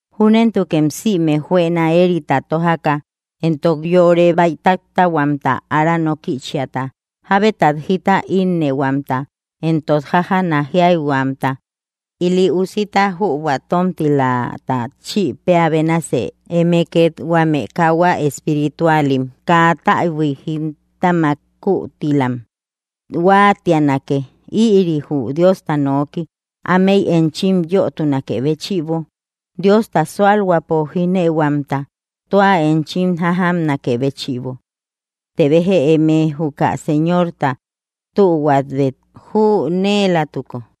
Júnentukem sïme juëna éerita tójaka, éntok yore bäitattäihuamta, ára nókïchiata, jábetat jita ínnëhuamta, éntok jájana jíaihuamta, ili usita jübua tómtilata chïpeä bénasi eme két huame kauhua espiritualim kaa täbui jítamak kuutilam huáatianake, ïri jü Diosta noki, ámei enchim yötunakë béchïbo Diosta súalhuäpo jínëuhuamta tua enchim jájamnakë béchïbo; të béja eme juka Señorta tühuabet jünëelatuko.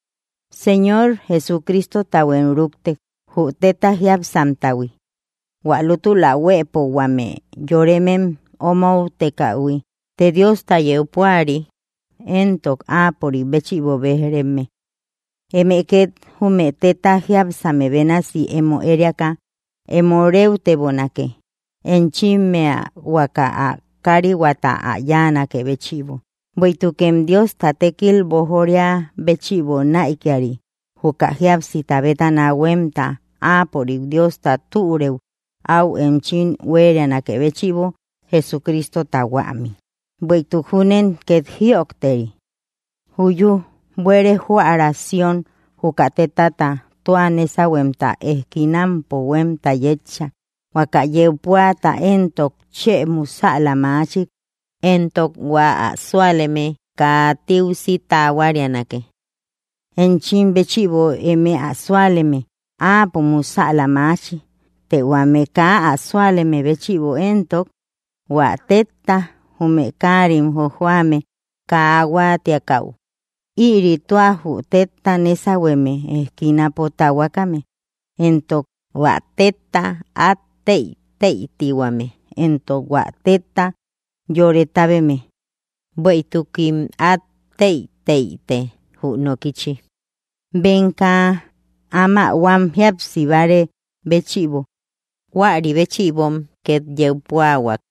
Señor Jesucristotahuem rúkte, jü tétta jiápsamtahui, hua lútula huëpo huame yoremem omoutekähui, të Diosta yeu púari éntok áapörik béchïbo béj‑reme. Eme két jume tétta jiápsame bénasi emo ériaka emo réutebonake, enchimmea huaka ä kárihua ä yáanakë béchïbo, bueïtukem Diosta tékil boojoria béchïbo näikiari, juka jíapsita bétana huémta áapörik Diosta türëu áu enchim huérianakë béchïbo Jesucristota huämi. Bueïtuk júnen két jïojteri: Juyú, buere joära Sión, juka tétata tua nésahuemta ejkinampo huémta yétcha, huaka yeu púata éntok chë musäla machik, éntok hua ä súaleme kaa tiusi tahuarianake. Enchim béchïbo, eme ä súaleme, áapo musäla maachi, të huame kaa ä súaleme béchïbo éntok: Huä tétta jume káarim jojoame kaa huáatiakäu, ïri tua jü tétta nésahueme ejkinapo tahuakame. Éntok: Huä tétta át tëitëitihuame, éntok hua tétta yore tábeme. Bueïtukim át tëitëite jü nokichi, bem kaa áma huam jíapsi bárë béchïbo; huäri béchïbom két yeu púahuak.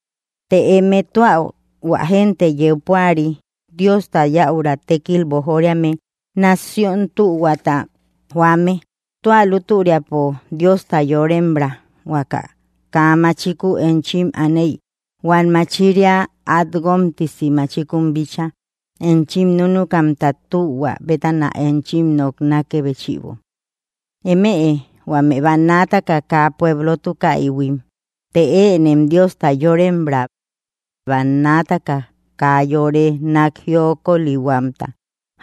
Të eme tua hua génte yeu púari, Diosta yäura tékkil boojoriame, nación tühuata joame, tua lútüriapo Diosta yorembra, huaka kaa machiku enchim aney huam machiria át guómtisi machikun bíchaa enchim núnukamta tühua bétana enchim noknakë béchïbo. Eme huame bannaataka kaa pueblotukaïhuim, të ënem Diosta yorembra; bannaataka kaa yore nak jiokolihuamta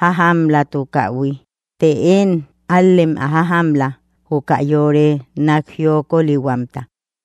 jájamlatukaïhui, të én ál‑lem ä jájamla, juka yore nak jiokolihuamta.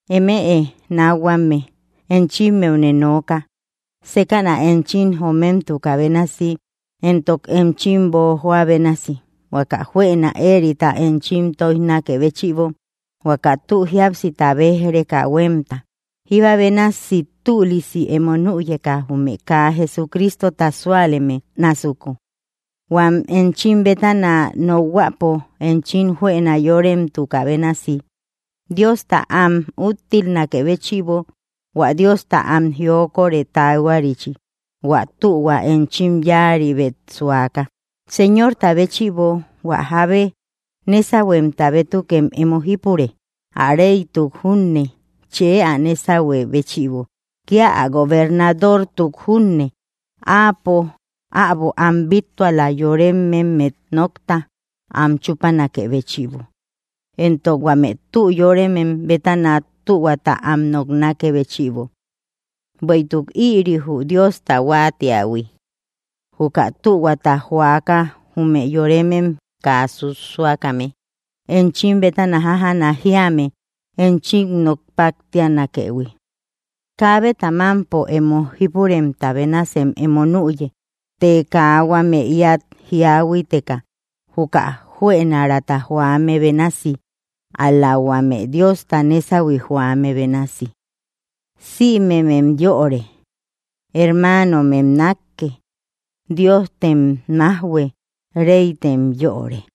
Eme nákhuame, enchimmeune nooka sékäna enchim jomemtukä bénasi, éntok enchim boojoä bénasi, huaka juëna éerita enchim tóijnakë béchïbo, huaka tü jíapsita béj‑reka huémta, jíba bénasi tülisi emo nüyeka jume kaa Jesucristota súaleme násuku; huam enchim bétana nokhuäpo enchim juëna yórememtukä bénasi Diosta am úttilnakë béchïbo hua Diosta am jiokorë taahuarichi, hua tühua enchim yáaribet suaka. Señorta béchïbo hua jábe nésahuemta bétukem emo jípure, ä reytuk junne, chë ä nésahuë béchïbo, kía ä gobernadortuk junne, áapo äbo am bíttuala, yorememmet nokta am chúpanakë béchïbo, éntok huame tü yóremem bétana tühuata am noknakë béchïbo. Bueïtuk ïri jü Diosta huáatiähui: juka tühuata joaka jume yoremem kaa susuakame enchim bétana jájana jíame enchim nok páttianakëhui. Kaabeta mámpo emo jípuremta bénasem emo nüye, të kaa huame íat jíahuiteka juka juënaraata joame bénasi, ál‑la huame Diosta nésahui joame bénasi. Sïmemem yöre. Hermanomem nákke. Diojtem májhue. Reytem yöre.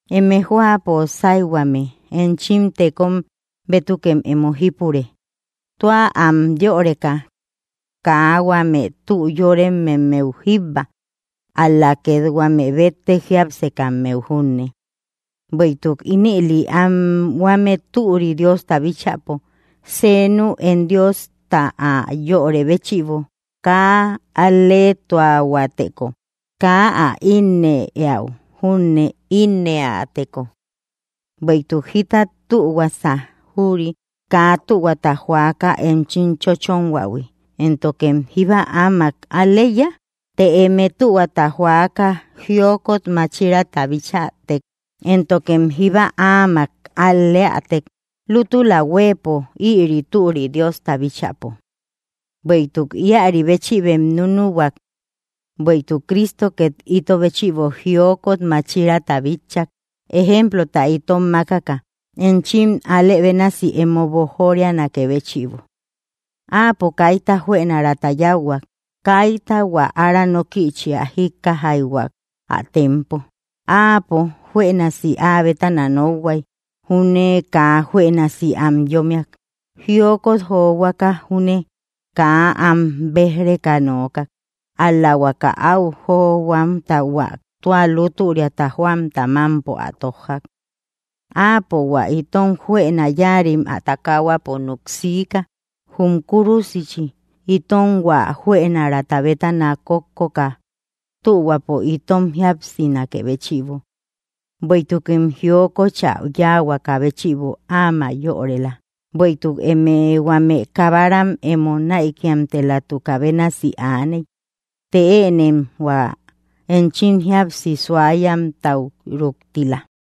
Eme jóapo sáyhuame, enchim tekom bétukem emo jípure, tua am yöreka; kaa huame tü yorememmeu jíbba, ál‑la két huame béttek jiápsekammeu junne. Bueïtuk ínëli anhuame türi Diosta bíchäpo senu én Diosta ä yörë béchïbo kaa al‑leetuahuäteko, kaa ä ínnë éäu júne ínnëateko. Bueïtuk jita tühuasa jüri kaa tühuata joaka enchim chónhuähui éntokem, ¿jíba áamak al‑leiya? Të eme tühuata joaka jiokot máchiraata bichätek éntokem jíba áamak al‑leätek, lútula huëpo ïri türi Diosta bíchäpo. Bueïtuk íäri béchïbem núnuhuak; bueïtuk Cristo két ito béchïbo jiokot máchiraata bitchak, ejemplota itom mákaka, enchim alë bénasi emo boojorianakë béchïbo. Áapo kaita juënaraata yáuhuak; kaita hua ára nókïchia jíkkaijhuak ä tempo. Áapo juënasi áa bétana nokhuay júne kaa juënasi am yómmiak; jiokot johuaka júne kaa am bé‑reka nookak, ál‑la huaka áu johuamta hua tua lútüriata joamta mámpo ä tójjak. Áapo hua itom juëna yáarim ä takahuapo núk siika jum kúrusichi, itom hua juënaraata bétana kókkoka tühuapo itom jíapsinakë béchïbo; bueïtukem jiokochä yáahuaka béchïbo áma yorela. Bueïtuk emëe huame kabaram emo näikimtelatukä bénasi aaney, të ënem hua enchim jíapsi suayamtau rúktila.